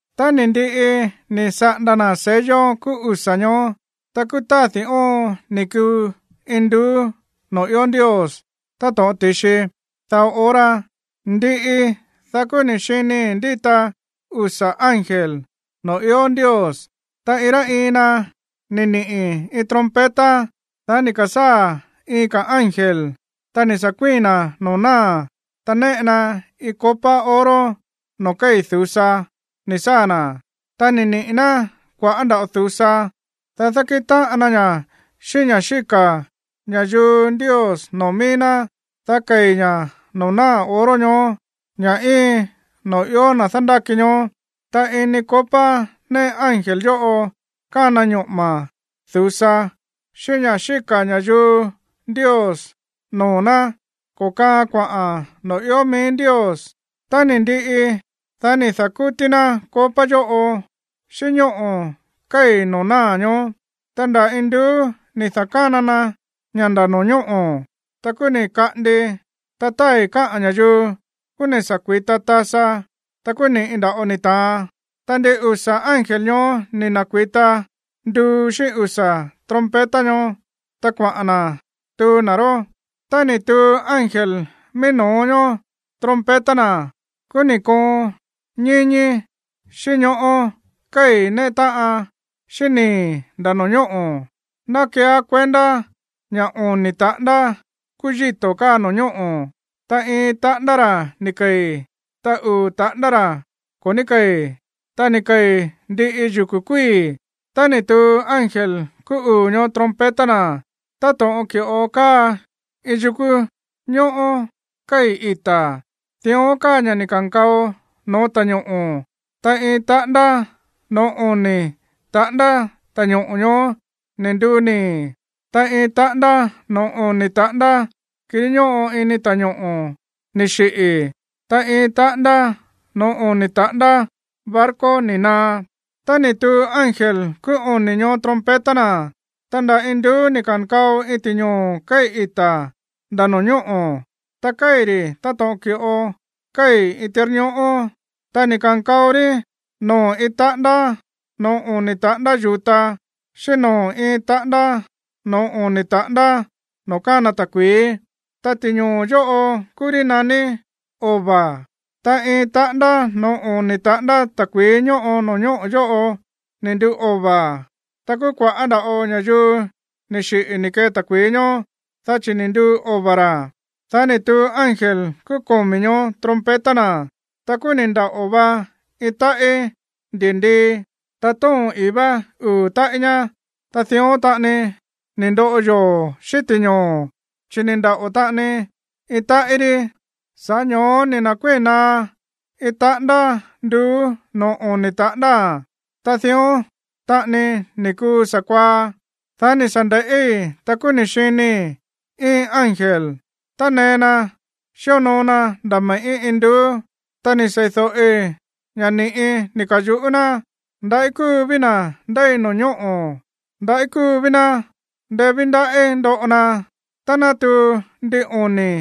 Tá ni̱ ndiꞌi ni̱ saꞌanda na̱ sello kúú usa̱ ñoó, ta kúú tádi̱ óon ni̱ kuu induú noo̱ ió Ndios táto̱ꞌon ti̱xi dao hora. Ndiꞌi, dá kúú ni̱ xinii̱ ndíta usa̱ ángel noo̱ ió Ndios, ta iin rá iin na ni̱ niꞌi̱ iin trompeta. Dá ni̱ ka̱sáa̱ iin ka̱ ángel, ta ni̱ sa̱ kuíi̱n na̱ noo̱ náa̱, ta néꞌe na iin copa oro noo̱ kéi̱ du̱sa ni̱ saa̱ na̱. Ta ni̱ niꞌi̱ ná kua̱ꞌá nda̱ꞌo du̱sa, dá dákíꞌin táꞌan na ña̱ xíꞌín ña̱ xíka̱ ña̱yuu Ndios noo̱ mií ná, dá kei̱ ña̱ noo̱ náa̱ oro ñoó, ña̱ íin no̱ó na̱ ió dándáki ñoó. Ta ini copa néꞌe ángel yóꞌo kána ñoꞌo̱ma̱ du̱sa xíꞌín ña̱ xíka̱ ña̱yuu Ndios noo̱ ná ko̱kaaan kuaꞌa̱n noo̱ ió mií Ndios. Tá ni̱ ndiꞌi, dá ni̱ da̱kútí ná copa yóꞌo xíꞌín ñóꞌo̱ kéi̱ noo̱ náa̱ ñoó. Ta nda̱ induú ni̱ da̱kána na ña̱ nda̱ no̱ñóꞌo̱, ta kúú ni̱ kaꞌandi, ta tái̱ káꞌa̱n ña̱yuu, kúú ni̱ sa̱ kui̱ta tasa, ta kúú ni̱ꞌi nda̱ꞌo ni̱ ta̱an. Ta ndin usa̱ ángel ñoó ni̱ na̱kui̱ta nduu xíꞌín usa̱ trompeta ñoó, ta kuaꞌa̱n na̱ tuu na̱ ró. Tá ni̱ tuu ángel mií no̱ó ñoó trompeta na̱, kúú ni̱ koon ñíñí xíꞌín ñoꞌó kéi̱ néꞌe táꞌan xíꞌín nii̱ nda̱ no̱ñóꞌo̱. Ná keeá kuendá ña̱ oni̱ taꞌándá kúú yíto̱ káa no̱ñóꞌo̱, ta iin taꞌándá ra̱ ni̱ kei̱, ta uu̱ taꞌándá ra̱ ko̱ ní kéi̱. Ta ni̱ kei̱ ndiꞌi yukú kuíi̱. Ta ni̱ tuu ángel kúú uu̱ ñoó trompeta na̱. Ta táto̱ꞌon ki̱ꞌo káa iin yúku̱ ñóꞌó kéi̱ ita̱, dión káa ña̱ ni̱ ka̱nkao no̱ó ta̱ñoꞌo̱. Ta iin taꞌándá noo̱ oni̱ taꞌándá ta̱ñoꞌo̱ ñoó ni̱ nduu nii̱. Ta iin taꞌándá noo̱ oni̱ taꞌándá kirí ñóꞌo ini ta̱ñoꞌo̱ ni̱ xiꞌi̱, ta iin taꞌándá noo̱ oni̱ taꞌándá barco ni̱ naá. Ta ni̱ tuu ángel kúú oni̱ ñoó trompeta na̱. Ta nda̱ induú ni̱ ka̱nkao iin ti̱ñoo̱ kéi̱ ita̱ nda̱ no̱ñóꞌo̱, ta kéi̱ ri̱ táto̱ꞌon ki̱ꞌo kéi̱ iin tirñoꞌó. Ta ni̱ ka̱nkao rí noo̱ iin taꞌándá noo̱ oni̱ taꞌándá yu̱ta, xíꞌín noo̱ iin taꞌándá noo̱ oni̱ taꞌándá noo̱ kána ta̱kui̱í. Ta ti̱ñoo̱ yóꞌo kúú rí naní Ova̱. Ta iin taꞌándá noo̱ oni̱ taꞌándá ta̱kui̱í ñóꞌo no̱ñóꞌo̱ yóꞌo ni̱ nduu ova̱. Ta kúú kua̱ꞌá nda̱ꞌo ña̱yuu ni̱ xiꞌi̱ ni̱ kee ta̱kui̱í ñoó, dá chi̱ ni̱ nduu ova̱ ra̱. Dá ni̱ tuu ángel kúú komi̱ ñoó trompeta na̱, ta kúú ni̱ ndaꞌo̱ va iin táꞌí ndi̱ndii, ta tóo̱n ii̱ vá uu̱ táꞌí ñá. Ta dión taꞌani ni̱ ndoꞌo yoo̱ xíꞌín ti̱ñoo̱, chi̱ ni̱ ndaꞌo̱ taꞌani iin táꞌí rí. Sa̱ꞌá ño̱ó ni̱ na̱kuíi̱n naá iin taꞌándá nduú noo̱ oni̱ taꞌándáa̱n, ta dión taꞌani ni̱ kuu sa̱kuaá. Dá ni̱ sa̱ nde̱ꞌí, ta kúú ni̱ xinii̱ iin ángel tánee na xíonoo na nda̱ me̱ꞌí induú, ta ni̱ seídóꞌi ña̱ ni̱ꞌi ni̱ ka̱yuꞌú ná: ―¡Ndaꞌí kúu ví na̱ ndéi no̱ñóꞌo̱! ¡Ndaꞌí kúu ví ná! ¡Ndeé ví ndaꞌí ndoꞌo na tá ná tuu ndin oni̱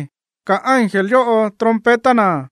ka̱ ángel yóꞌo trompeta na̱!